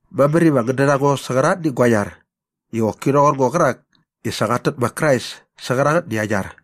Mamär iva ngän dät a ngo sä qärangätni gua iar i qoki rhoqor ngo qärak i sa qat tät ma Krais sä qärangätni aa iar.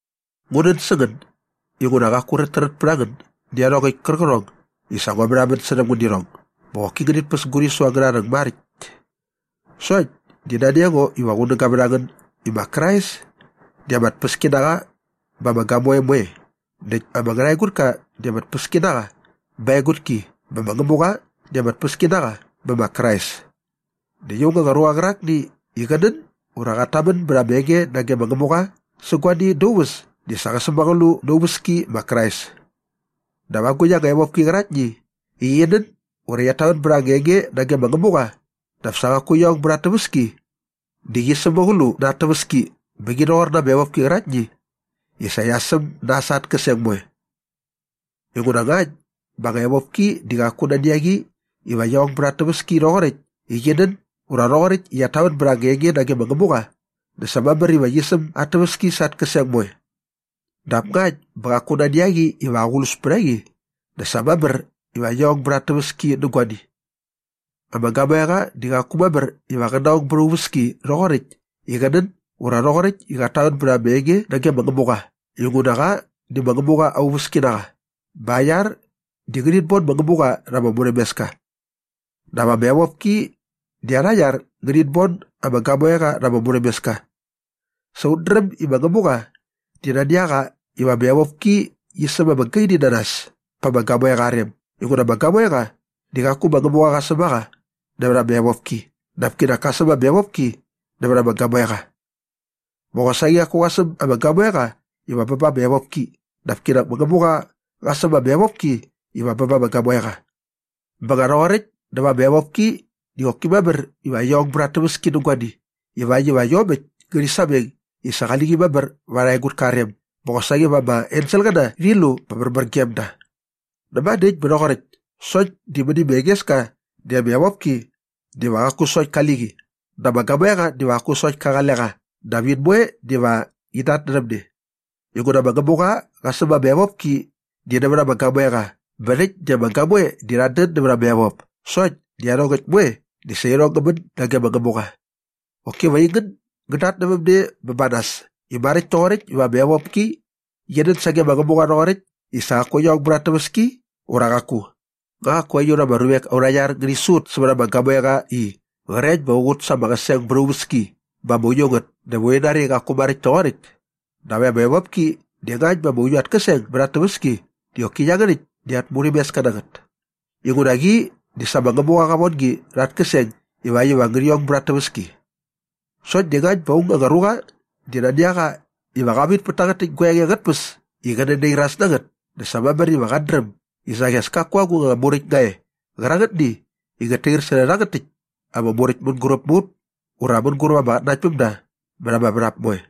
Ngu nän sä ngän inguna qaku räträt pät a ngän nä iarhongäkt kärqärhong i sa ngua märhamän särhäm ngän nä irhong bä qoki ngänit päs gu rhisu angärha rhäng maräkt. Sokt di nani a ngo iva qunäga vät a ngän i ma Krais di ama tpäski na qa ba ama gamoe moe näkt ama ngärhaegutka di ama tpäski na qa ba aa egutki bä ma Ngämuqa di ama tpäski na qa bä ma Krais. Näkt aung anga ruqa qärakni i qä nän ura qat tamän bät anga enge nage ma Ngämuqa sä guani da aa uväs di qä sämäqlu na aa uväski ma Krais. Dap agukt anga evopki qäraktni i qi nän ura qiat tamän bät anga enge nage ma Ngämuqa dap sa qaku qia ong bät at täväski di qi sämäqlu na at täväski bä qi di qi rhoqor ama evopki qäraktni i sa qia säm nas sa at käseng moe. Inguna ngakt bä anga evopki di qaku nani a qi iva qi ong bät at täväski rhoqoräkt i qi nän ura rhoqoräkt i qiat tamän bät anga enge nage ma Ngämuqa dä sa mamär iva qi säm at täväski sa at käseng moe. Dap ngakt bä qaku nani a qi iva aqlus pät a qi dä sa mamär iva qi ong bät at täväski nä guani. Ama gamoeqa di qaku mamär iva qä naong bät aa uväski rhoqoräkt i qä nän ura rhoqoräkt i qat tamän bät anga enge nage ma Ngämuqa inguna qa di ma Ngämuqa aa iauski na qa bä aa iar ngärhit bon ma Ngämuqa rha ama murhämeska. Dap ama evopki di arha iar ngärhit bon ama gamoeqa rha ama murhämeska. Sa ut dräm i ma Ngämuqa di nani a qa iva ama evopki qi säm ama gaini na nas pa ama gamoeqa aa rem inguna ama gamoeqa di qaku ma Ngämuqa qa säm a qa nävät ama evopki dap kinak ka säm ama evopki nävät ama gamoeqa. Bä qosaqi qaku qa säm ama gamoeqa iva bä ba ama evopki dap kinak ma Ngämuqa qa säm ama evopki iva bä ba ama gamoeqa. Bä nga rhoqoräkt dä va ama evopki di qoki mamär iva qi ong bät at täväski nä guani ivakt iva iomäkt ngärhi sameng i sa qali qi mamär va arha egutka aa rem bä qosaqi va ama enselqäna rhi lu bä märmär gem da. Näma dä äkt bä rhoqoräkt sokt di mäni ma Engeska di ama evopki diva qaku sokt ki qali qi dä ama gamoeqa diva qaku sokt ka qale qa dap in moe diva in datnärhäm ne. Inguna ma Ngämuqa qa säm ama evopki di nävät ama gamoeqa bä rhäkt di ama gamoe di rhat dän näva ama evop sokt di iarhongäkt moe di sa irhong ngä män nage ma Ngämuqa. Qoki va aingän ngän datnävämne bä ba nas i maräkt toqoräkt iva ama evopki qi nän sage ma Ngämuqa rhoqoräkt i sa qaku qia ong bät at täväski ura qaku. Nga qaku aiut ama ruvek aurha iar di ngärhi su ut sävät ama gamoeqa i qrekt bä qa qut sa ama qäseng bät aa uväski bä ama uiu ngät dä va urhi nari i qaku maräkt toqoräkt? Dap ama evopki di ngakt bä ama uiu at käseng bät at täväski di qoki iangärhäkt di at murhämeska na ngät. Inguna qi di sa ma Ngämuqa qa von gi rha at käseng ivakt iva ngärhi ong at täväski. Sokt di ngakt bä aung anga ruqa di nani a qa iva qa vit pät tangät täkt gua enge angät tpäs i qä nänairas na ngät dä sa mamär iva qat dräm i saqi as kaku agung anga muräkt nga e qärangätni i ngät tair särhä rhangät täkt ama muräkt mänguräp mä ut ura mänguräp ama qatnanaktpämda mät ama värhap moe.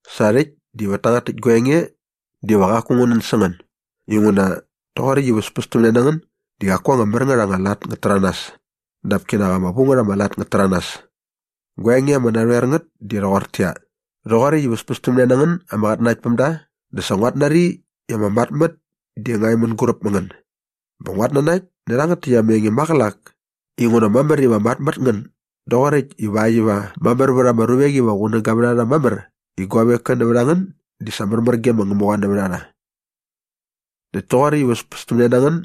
Sa rhäkt di vät tangät täkt gua enge diva qaku ngu nän sä ngän inguna rhoqoräkt i väspästämne na ngän di qaku anga mär ngät anga lat ngät täranas dap kinak ama vu ngät ama lat ngät täranas. Gua enge ama narhoer ngät di rhoqortäqyia, rhoqoräkt i väspästämne na ngän ama qatnanaktpämda dä sa nguat nari i ama matmät di nga e mänguräp mä ngän. Bä nguat nanakt nä rhangät täkt ama enge maqälak inguna mamär iva mat mät ngän doqoräkt ivakt iva mamär vät ama ruvek iva qunäga vät a rha mamär i guavek koe nävät a ngän di sa märmär ge ma Ngämuqa nävät a rha. Näkt toqoräkt i väspästämne na ngän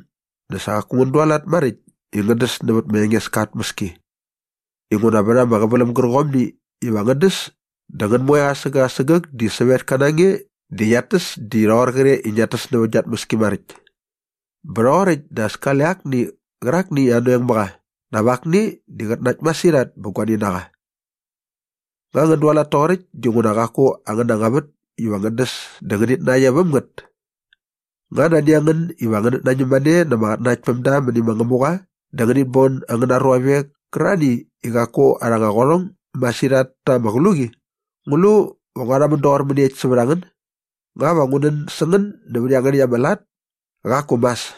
dä sa qaku ngän dualat maräkt i ngän däs nävät ma Engeska aa tmäski inguna vät ama qäväläm gärqomni iva ngän däs dä ngän moe asägäk asägäk di sävetka na nge di ngiat täs di rhoqor qre i ngiat täs nävät gia tmäski maräkt. Bä rhoqoräkt dä as kale akni qärakni i anoeng mä qa dap akni di qät nakt masirhat bä guani na qa. Nga ngän dualat toqoräkt dinguna qaku angäna anga vät iva ngän däs dä ngänit nakt e väm ngät? Nga nani a ngän iva ngänät nañäm mane na ama qatnanaktpämda mäni ma Ngämuqa dä ngänit bon angäna ruavek kärarhani i qaku arha anga qärhong masirhat ta ama qluqi? Ngu lu va ngua rhamän doqor mäniekt sävät a ngän? Nga va ngu nän sä ngän nävät iangärhäkt angäna lat? Qaku mas!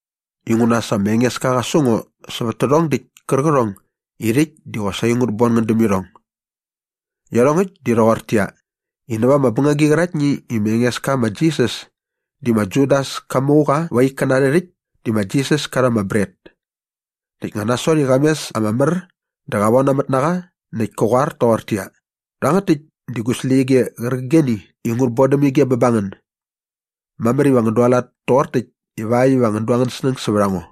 Inguna sa ma Engeska qa su ngo sävät tärhong däkt kärqärhong i rhäkt di qosaqi ngut bon ngän däm irhong. Iarhongäkt di rhoqortäqyia, i näva ama bängagi qäraktni i ma Engeska ma Jisas di ma Judas ka mu qa va aa ikkäna arhä rhäkt di ma Jisas ka rha ama bret näkt nga nasot i qa mes ama mär dä qa vonamät na qa näkt ka qoar toqortäqyia, “Rhangät täkt di gu släqyige qärqigeni i ngut bodäm ige iva bä ba ngän. Mamär iva ngän dualat toqor täkt ivakt iva ngän du angän snäng sävät a ngo.”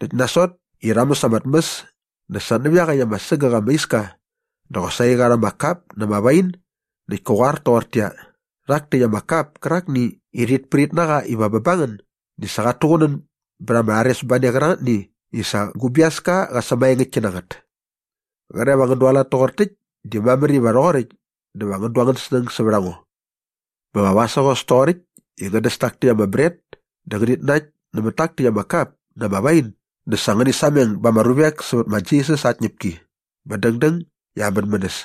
Näkt nasot i rha mäs ama tmäs dä sa nävä iaqäkt ama sägäk ama iska dä qosaqi qa rha ama kap na ama wain näkt ka qoar toqortäqyia, “Rhak täkt ama kap kärakni i rhit prit na qa iva bä ba ngän di sa qat tuqunän bät ama rharesbane qärangätni i sa gu biaska qa sämaengäktki na ngät. Qre va ngän dualat toqor täkt di mamär iva rhoqoräkt dä va ngän du angän snäng sävät a ngo.” Bä va vasägos toqoräkt i ngän däs tak täkt ama bret dä ngänit nakt nämät tak täkt ama kap na ama wain dä sa ngäni sameng ba ama ruvek sävät ma Jisas aa tñäpki bä dängdäng i aa mänmänäs.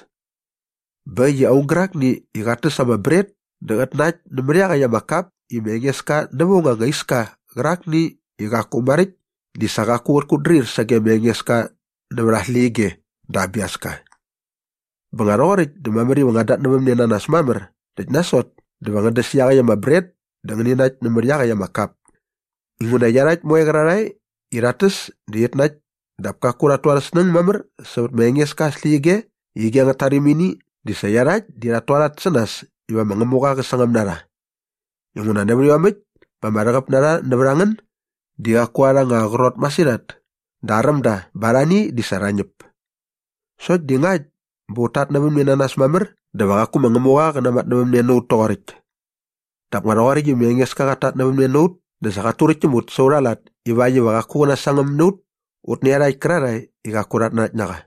Bä äkt i aung gärakni i qat täs ama bret dä qät nakt nämät iaqäkt ama kap i ma Engeska näva aung anga iska qärakni i qaku maräkt di sa qaku qät kutdrir sage ma Engeska nävät aa släqyige dä aa biaska. Bä nga rhoqoräkt dä mamär iva ngän datnävämne na nas mamär näkt nasot dä va ngän däs iaqäkt ama bret dä ngäni nakt nämät iaqäkt ama kap. Inguna iarhakt moe qärarhae i rhat täs dä rhit nakt dap kaku rhat tu arhä snäng mamär sävät ma Engeska aa släqyige ige angät tarimini di sa iarhakt di rhat tualat sä nas iva ma Ngämuqa qä sangäm na rha. Inguna nävät iomäkt bä ama rhäqäp na rha nävät a ngän di qaku arha anga qrot masirhat dä aräm da bä arhani di sa rha ñäp. Sokt di ngakt bä ut tatnävämne na nas mamär dä va qaku ma Ngämuqa qä namatnävämne na ut toqoräkt. Dap nga rhoqoräkt i ma Engeska qat tatnävämne na ut dä sa qat turäkt täm ut sa aurha lat ivakt iva qaku qä nasangäm na ut ut nä iarhakt kärarhae i qaku rhat nanakt na qa.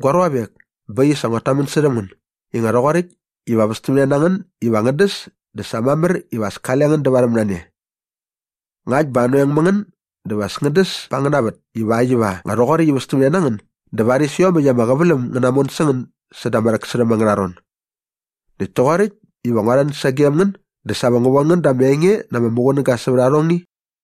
Gua ruavek, bä äkt i sa nguat tamän särhäm ngän i nga rhoqoräkt iva västämne nä ngän iva ngän däs dä sa mamär iva as kale ngän dävarhäm na ne. Ngakt bä anoeng mä ngän dä va as ngän däs pa angäna vät ivakt iva nga rhoqoräkt i västämne na ngän dä varis iomäkt ama qäväläm ngä namon sä ngän säda ama rhäksärhäm angärha ron. Näkt toqoräkt iva ngua rhän sagem ngän dä sa va ngu von ngän da ama enge na ama muqunäga sävät arhongni.